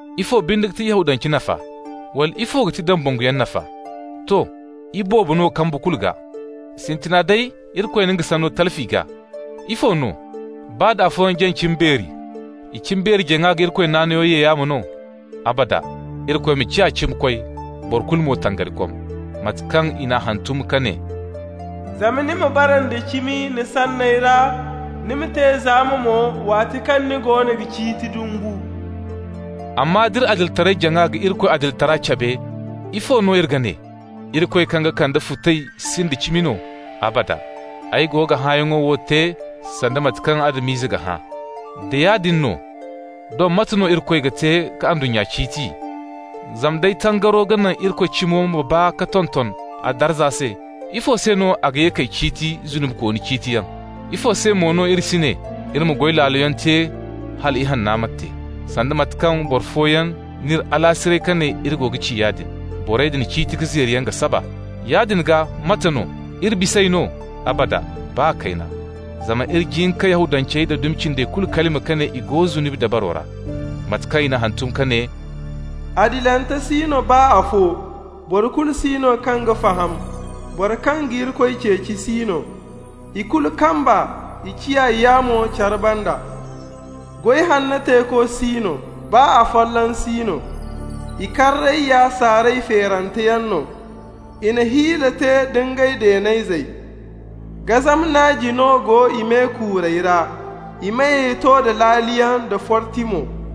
Ifo binde ga ti Yahudance nafa? Wala ifo ga ti dambanguyaŋ nafa? To! Iboobo no kambu kulu gaa. Sintina day, Irikoy na nga Sanno talfi i gaa. Ifo no? Baa da afooyaŋ jaŋ cimbeeri, i cimbeeri-jaŋa ga Irikoy naanayo ye yaamo no? Abada! Irikoy ma ciya cimikoy, boro kulu mo tangarikom, mate kaŋ i n'a hantum ka ne: «Zama ni ma bara nda cimi ni sanney ra, Ni ma te zaama mo waati kaŋ ni goono ga ciiti dumbu.» Amma d'iri adilitaray-jaŋa ga Irikoy adilitara cabe, ifo no iri ga ne? Irikoy kaŋ ga kande futay sinda cimi no? Abada! (Ay go ga hãayaŋo wo te sanda mate kaŋ Adam-ize ga hã). Da yaadin no, doŋ mate no Irikoy ga te ka ndunnya ciiti? Zama nd'ay tangaro ga naŋ Irikoy cimo ma baa ka tonton a darza se, ifo se no a ga ye k'ay ciiti zunubikooni ciitiyaŋ? Ifo se mo no iri si ne: «Iri ma goy laaloyaŋ te hala ihanno ma te.» (sanda mate kaŋ boro fooyaŋ n'iri alaasiray ka ne iri go ga ci yaadin). Borey din ciiti ka zeeriyaŋ ga saba. Yaadin gaa, mate no? Iri bis'ey no? Abada! Baa kayna! Zama iri jin ka Yahudancey da dumi cindey kulu kalima ka ne i go zunubi dabaro ra. Mate kaŋ i n'a hantum ka ne: «Adilante si no, baa afo. Boro kulu si no kaŋ ga faham, boro kaŋ ga Irikoy ceeci si no. I kulu kamba, i ciya yaamo care banda. Goy hanno teeko si no, baa afolloŋ si no.» «I karrey ya saaray feeranteyaŋ no, I na hiila te da ngey deenayzey.» «Gazama naaji no go i me-kuurey ra,» «I meyey to da laaliyaŋ da forti mo.»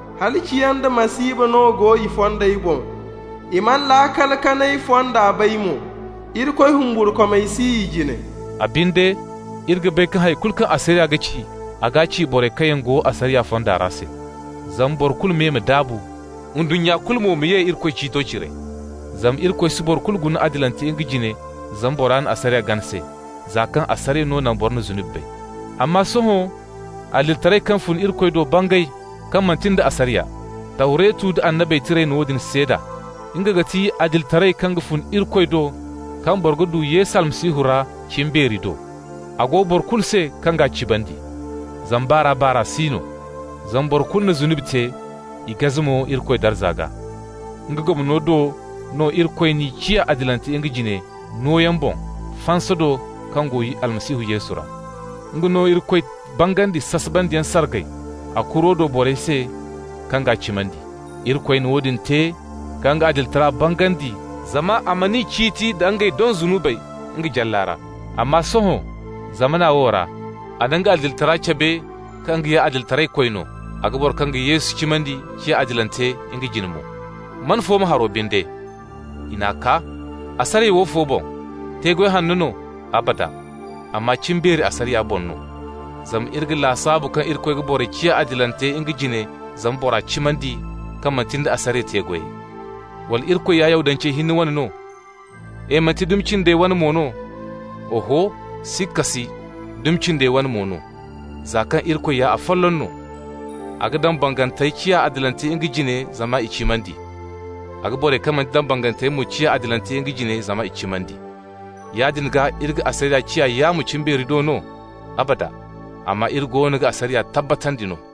Halaciyaŋ da masiiba no go i fondey boŋ. I mana laakal kanay fonda bay mo.» «Irikoy humburkumay si i jine.» A binde, iri ga bay kaŋ hay kulu kaŋ asariya ga ci, a g'a ci borey kaŋ yaŋ go asariya fonda ra se. Zama boro kulu me ma daabu, ndunnya kulu mo ma ye Irikoy ciito cire. Zama Irikoy si boro kulu guna adilante nga jine zama bora na asariya gana se, za kaŋ asariya no naŋ boro na zunubi bay. Amma sohõ, adilitaray kaŋ fun Irikoy do bangay, kaŋ manti nda asariya. Tawretu nda Annabey Tirey na woodin seeda. Nga ga ti adilitaray kaŋ ga fun Irikoy do kaŋ boro ga du Yesu Almasihu ra cimbeeri do. A go boro kulu se kaŋ g'a cimandi. Zama baar'a-baar'a si no. Zama boro kulu na zunubi te, i gaze mo Irikoy darza gaa. Nga gomno do no Irikoy n'i ciya adilante nga jine, nooyaŋ boŋ, fansa do kaŋ go Almasihu Yesu ra. Nga no Irikoy bangandi sasabandiyaŋ sargay a kuro do borey se kaŋ g'a cimandi. Irikoy na woodin te ka nga adilitara bangandi zama a man'i ciiti nda ngey doŋ zunubey nga jalla ra. Amma sohõ, zamana wo ra, a na nga adilitara cabe, kaŋ nga ya adilitaraykoy no, a ga boro kaŋ ga Yesu cimandi ciya adilante nga jine mo. Man fooma haro binde? I n'a kaa! Asariya woofo boŋ? Te-goy wane no? Abada! Amma cimbeeri asariya boŋ no. Zama iri ga lasaabu kaŋ Irikoy ga boro ciya adilante nga jine zama bora cimandi, kaŋ manti nda asariya te-goyey. Wala Irikoy ya Yahudancey hinne wane no? E! Manti dumi cindey wane mo no? Oho, sikka si, dumi cindey wane mo no, za kaŋ Irikoy ya afolloŋ no. A ga dambangantey ciya adilante nga jine zama i cimandi. A ga borey kaŋ manti dambanganteyaŋ mo ciya adilante nga jine zama i cimandi. Yaadin gaa iri ga asariya ciya yaamo cimbeeri do no? Abada! Amma iri goono ga asariya tabbatandi no.